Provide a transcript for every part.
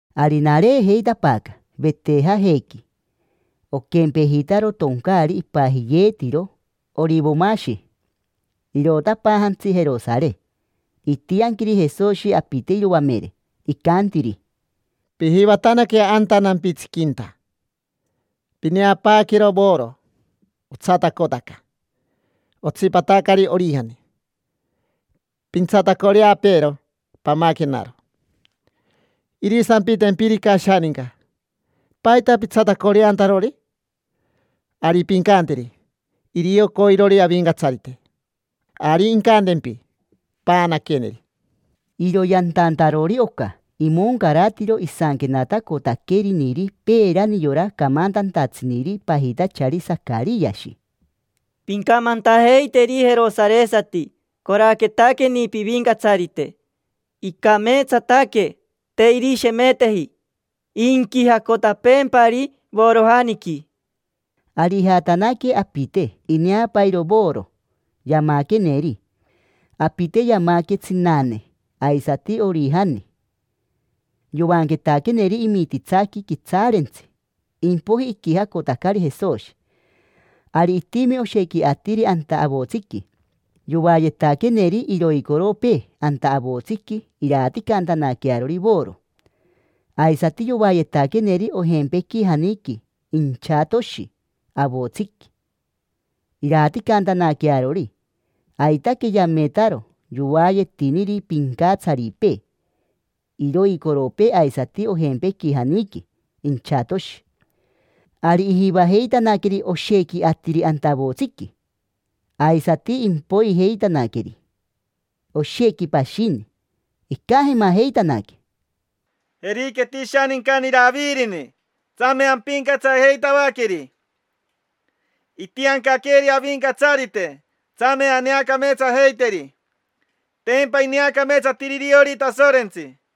Ari nareejeitapaaca Vetejajequi, oquempejitaro toncaari ipajiyeetiro Orivomashi. Irotapaajantsi Jerosare. Itianquiri Jesoshi apite iroamere, icantiri: —Pijivatanaque anta nampitsiquinta. Pineapaaquero voro, otsatacotaca; otsipatacari orijani. Pintsatacoreapeero, pamaquenaro. Irisampitempirica ashaninca: “¿Paita pitsatacoreantarori?” Ari pincanteri: “Irio coirori Avincatsarite”. Ari incantempi: “Paanaqueneri”. Iro yantantarori oca, imoncaratiro isanquenatacotaqueriniri peerani yora camantantatsiniri pajitachari Sacariashi: “Pincamantajeiteri jerosaresati: ‘Coraquetaqueni pivincatsarite. Icameetsataque, te irishemeteji. Inquijacotapeempari vorojaniqui’”. Ari ijatanaque apite, ineapairo voro, yamaqueneri. Apite yamaque: tsinane, aisati orijani. Yoanquetaqueneri imititsaqui quitsaarentsi, impoiji iquijacotacari Jesoshi. Ari itimi oshequi atiri anta avotsiqui, yoayetaqueneri iroicoropee anta avotsiqui iraaticantanaquearori voro. Aisati yoayetaqueneri ojempequijaniqui inchatoshi avotsiqui, iraaticantanaquearori. Aitaque yametaro yoayetiniri pincatsaripee iroicoropee aisati ojempequijaniqui inchatoshi. Ari ijivajeitanaqueri oshequi atiri anta avotsiqui, aisati impoijeitanaqueri oshequi pashini. Icajemajeitanaque: —Jeriqueti ishanincani Iravirini, tsame ampincatsajeitavaqueri. Itiancaqueri Avincatsarite, tsame aneacameetsajeiteri. Tempa ineacameetsatiri iriori Tasorentsi.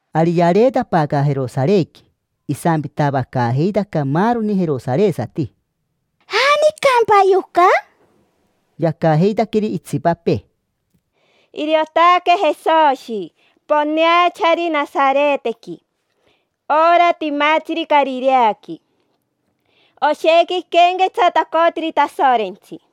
Ari yareetapaaca Jerosarequi. Isampitavacaajeitaca maaroni jerosaresati: —¿Janicampa yoca? Yacajeitaqueri itsipapee: —Iriotaque Jesoshi, poneachari Nasaretequi, ora timatsiri Carireaqui. Oshequi iquenquetsatacotiri Tasorentsi.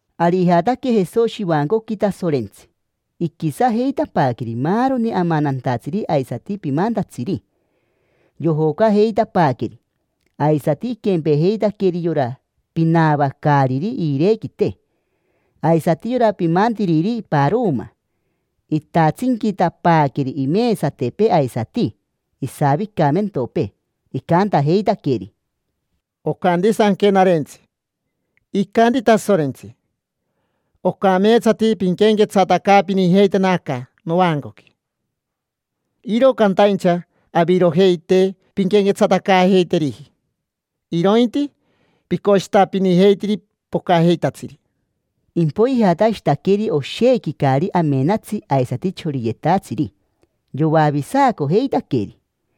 Ari ijataque Jesoshi ivancoqui Tasorentsi, iquisajeitapaaqueri maaroni amanantatsiri aisati pimantatsiri, yojocajeitapaaqueri. Aisati iquempejeitaqueri yora pinaavacaariri iirequite, aisati yora pimantiriri paroma: itatsinquitapaaqueri imesatepee aisati isavicamentopee. Icantajeitaqueri: —Ocanti Sanquenarentsi: “Icanti Tasorentsi: ‘Ocameetsati pinquenquetsatacaapinijeitena aca novancoqui’”. Iro cantaincha avirojei te pinquenquetsatacaajeiteriji, irointi picoshitapinijeitiri pocajeitatsiri. Impoiji ijatashitaqueri oshequi caari amenatsi aisati choriyetatsiri. Yoavisacojeitaqueri.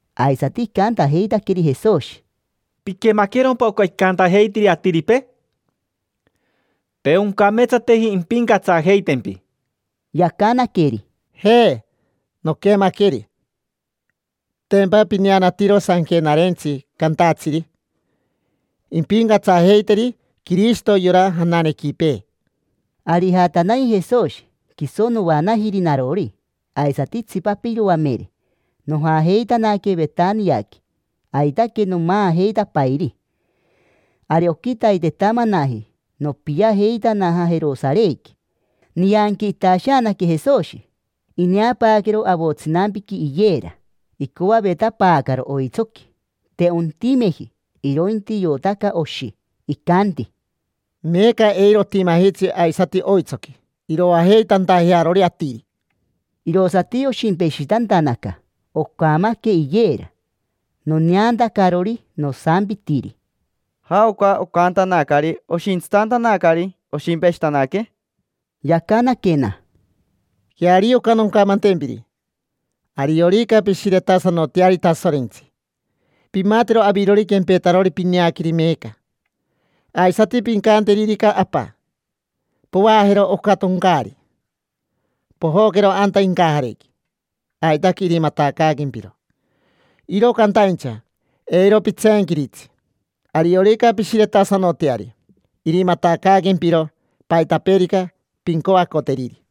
aisati icantajeitaqueri Jesoshi: —¿Piquemaquerompa oca icantajeitiri atiripee? Te oncameetsateji impincatsajeitempi. Yacanaqueri: —Je, noquemaqueri. Tempa pineanatiro Sanquenarentsi cantatsiri: “Impincatsajeiteri Quirishito yora jananequipee”. Ari ijatanaji Jesoshi, quiso noanajiri narori, aisati itsipapee iroamere. Nojajeitanaque Vetaniaqui, aitaque nomaajeitapairi. Ari oquitaitetamanaji nopiajeitanaja Jerosarequi. Nianqui itasheanaque Jesoshi. Ineapaaquero avotsinampiqui iyera. Icoavetapaacaro oitsoqui, te ontimeji; irointi iotaca oshi. Icanti: —Meeca eiro otimajitsi aisati oitsoqui iroajeitantajearori atiri. Irosati oshimpeshitantanaca, ocamaque iyera. Noneantacarori, nosampitiri: —¿Jaoca ocantanacari oshintsitantanacari oshimpeshitanaque? Yacanaquena: —Queario oca noncamantempiri: ariorica pishiretasanoteari Tasorentsi, pimatero avirori quempetarori pineaqueri meeca. Aisati pincanteririca Apa: “Povaajero oca toncaari, pojoquero anta incajarequi”, aitaque irimatacaaquempiro. Iro cantaincha, eiro pitseenquiritsi. Ariorica pishiretasanoteari, irimatacaaquempiro paitapeerica pincoacoteriri.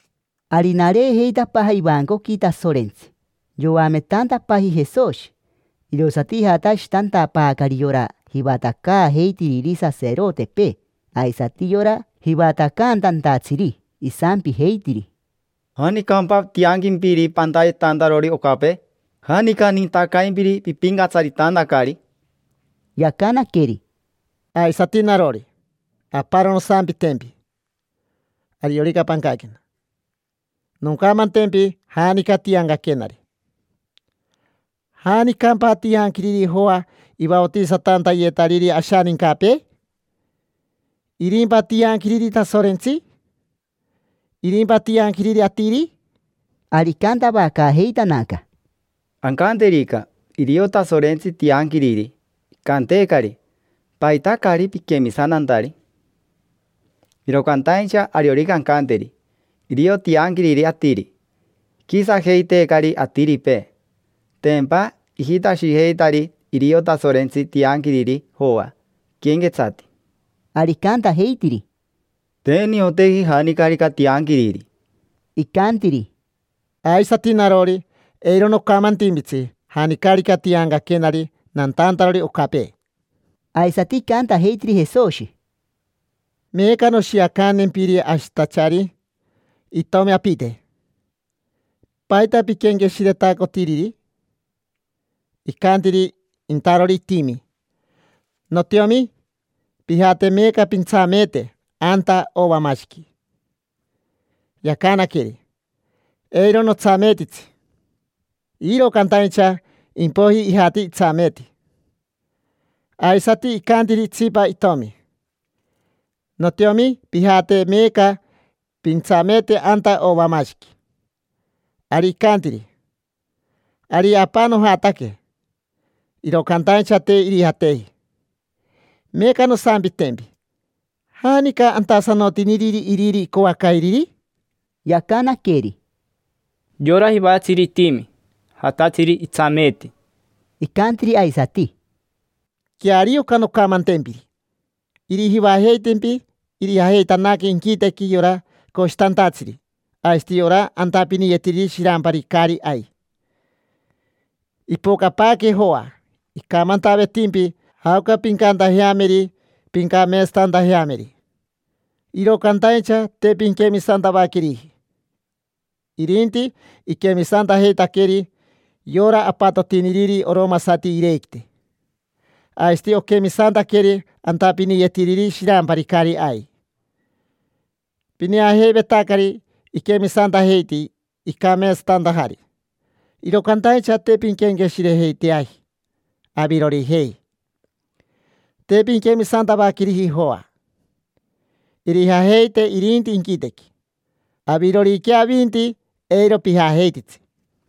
Ari nareejeitapaaja ivancoqui Tasorentsi, yoametantapaaji Jesoshi. Irosati ijatashitantapaacari yora jivatacaajeitiriri saserotepee aisati yora jivatacantantatsiri, isampijeitiri: —¿Janicampa tianquimpiri pantayetantarori ocapee? ¿Janica nintacaimpiri pipincatsaritantacari? Yacanaqueri: —Aisati narori, aparo nosampitempi: ariorica pancaquena, noncamantempi janica tiancaquenari. ¿Janicampa tianquiriri Joa ivaotisatantayetariri ashanincapee? ¿Irimpa tianquiriri Tasorentsi? ¿Irimpa tianquiriri atiri? Ari icantavacaajeitanaca: —Ancanteririca: “Irio Tasorentsi tianquiriri”, icanteecari: “¿Paita caari piquemisantantari?” Iro cantaincha ariorica ancanteri: “Irio tianquiriri atiri”, iquisajeiteecari atiripee. Tempa ijitashijeitari irio Tasorentsi tianquiriri Joa iquenquetsati. Ari icantajeitiri: —Te nioteji janicarica tianquiriri. Icantiri: —Aisati narori, eiro nocamantimpitsi janicarica tiancaquenari nantantarori ocapee. Aisati icantajeitiri Jesoshi: —Meeca noshiacantempiri ashitachari itomi apite: ¿paita piquenqueshiretacotiriri? Icantiri intarori itimi: “Notiomi, pijate meeca pintsameete anta ovamashiqui”. Yacanaqueri: “Eiro notsameetitsi”, iro cantaincha impoiji ijati itsameeti. Aisati icantiri itsipa itomi: “Notiomi, pijate meeca pintsameete anta ovamashiqui”. Ari icantiri: “Ari, apa, nojataque”. Iro cantaincha te irijateji. Meeca nosampitempi: ¿janica antasanotiniriri iriri icoacairiri? Yacanaqueri: —Yora jivatatsiri itimi, jatatsiri itsameeti. Icantiri aisati: —Queario oca noncamantempiri: irijivajeitempi irijajeitanaque inquitequi yora coshitantatsiri aisati ora antapiniyetiriri shirampari caari ai. Ipocapaaque Joa icamantavetimpi jaoca pincantajeameri pincameetsatantajeameri, iro cantaincha te pinquemisantavaqueriji. Irinti iquemisantajeitaqueri yora apatotiniriri oromasati iirequite, aisati oquemisantaqueri antapiniyetiriri shirampari caari ai. Pineajeivetacari iquemisantajeiti icameetsatantajari, iro cantaincha te pinquenqueshirejeiteaji avirorijei; te pinquemisantavaqueriji Joa. Irijajeite irinti inquitequi: aviroriquea avinti, eiro pijajeititsi.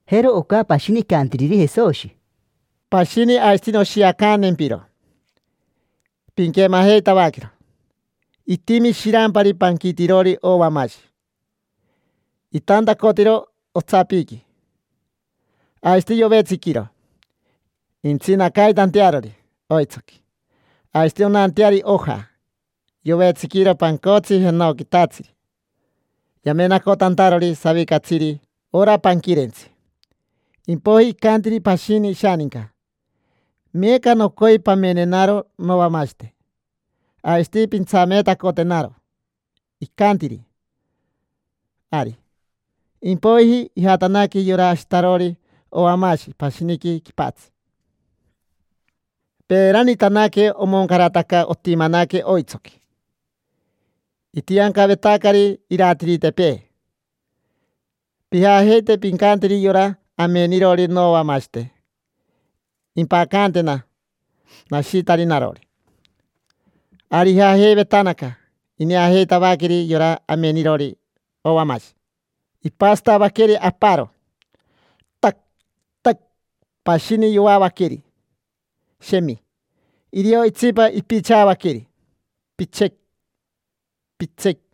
Jero oca pashini icantiriri Jesoshi: —Pashini aisati noshiacantempiro: pinquemajeitavaquero. Itimi shirampari panquitirori ovamashi. Itantacotiro otsapiqui. Aisati yovetsiquiro intsinacaitantearori oitsoqui, aisati onanteari oja. Yovetsiquiro pancotsi jenoquitatsiri yamenacotantarori savicatsiri ora panquirentsi. Impoiji icantiri pashini ishaninca: “Meeca nocoi pamenenaro novamashite, aisati pintsameetacotenaro”. Icantiri: “Ari”. Impoiji ijatanaque yora ashitarori ovamashi pashiniqui quipatsi. Peeranitanaque omoncarataca otimanaque oitsoqui. Itiancavetacari iratiritepee: “Pijajeite pincanteri yora amenirori novamashite impacantena nashitari narori”. Ari ijajeivetanaca. Ineajeitavaqueri yora amenirori ovamashi: ipasatavaqueri aparo, tac, tac; pashini yoavaqueri, shemi; irio itsipa ipichavaqueri, pitse, pitse.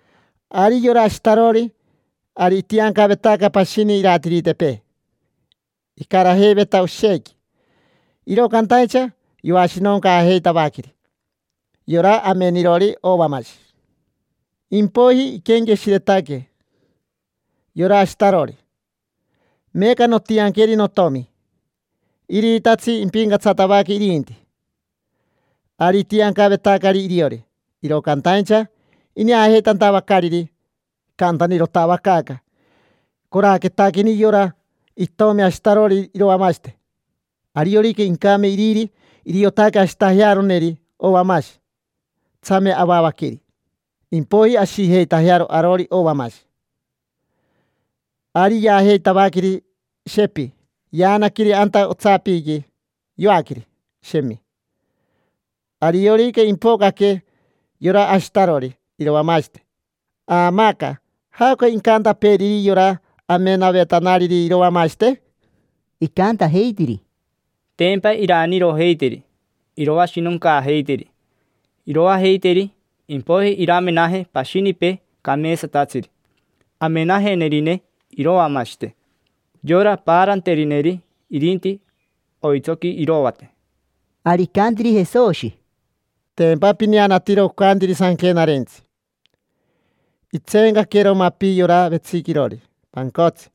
Ari yora ashitarori, ari itiancavetaca pashini iratiritepee, icarajeiveta oshequi. Iro cantaincha yoashinoncaajeitavaqueri yora amenirori ovamashi. Impoiji iquenqueshiretaque yora ashitarori: “Meeca nontianqueri notomi. Iriitatsi impincatsatavaque irinti”. Ari itiancavetacari iriori. Iro cantaincha ineajeitantavacariri, icantanirotavacaaca: “Coraquetaqueni yora itomi ashitarori iroamashite. Ariorica incame iriri, iriotaque ashitajearoneri ovamashi. Tsame avavaqueri, impoiji ashijeitajearo arori ovamashi”. Ari yaajeitavaqueri, shepi; yaanaqueri anta otsapiqui, yoaqueri, shemi. Ariorica impocaque yora ashitarori iroamashite, aamaaca, ¿jaoca incantapeeriri yora amenavetanariri iroamashite? Icantajeitiri: —Tempa iraanirojeiteri, iroashinoncaajeiteri, iroajeiteri. Impoiji iramenaje pashinipee cameetsatatsiri, amenajenerine iroamashite, yora paaranterineri irinti oitsoqui irovate. Ari icantiri Jesoshi: —Tempa pineanatiro ocantiri Sanquenarentsi: “Itseencaquero mapi yora vetsiquirori pancotsi,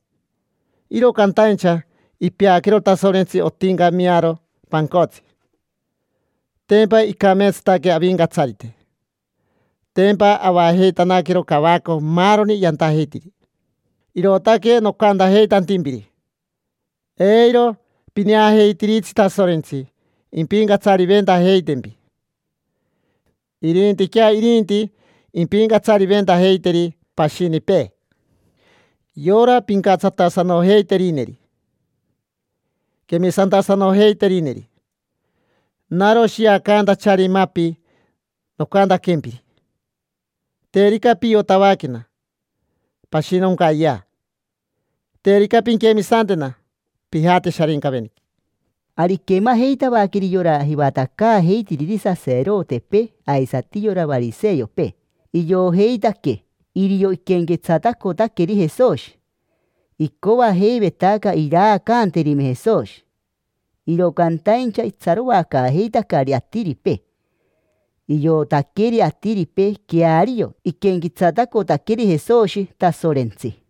iro cantaincha ipeaquero Tasorentsi otincamiaro pancotsi. Tempa icameetsataque Avincatsarite, tempa avajeitanaquero cavaco maaroni yantajeitiri”. Irootaque nocantajeitantimpiri: eiro pineajeitiritsi Tasorentsi impincatsariventajeitempi. Irintiquea irinti impincatsariventajeiteri pashinipee: yora pincatsatasanojeiterineri, quemisantasanojeiterineri. Naro shiacantachari mapi nocantaquempiri: terica piotavaquena, pashinoncayea; terica pinquemisantena, pijate Sharincaveniqui. Ari iquemajeitavaqueri yora jivatacaajeitiriri saserotepee aisati yora variseopee. Iojeitaque irio iquenquetsatacotaqueri Jesoshi. Icoajeivetaca iraacanterime Jesoshi, iro cantaincha itsaroacaajeitacari atiripee. Iotaqueri atiripee queario iquenquetsatacotaqueri Jesoshi Tasorentsi.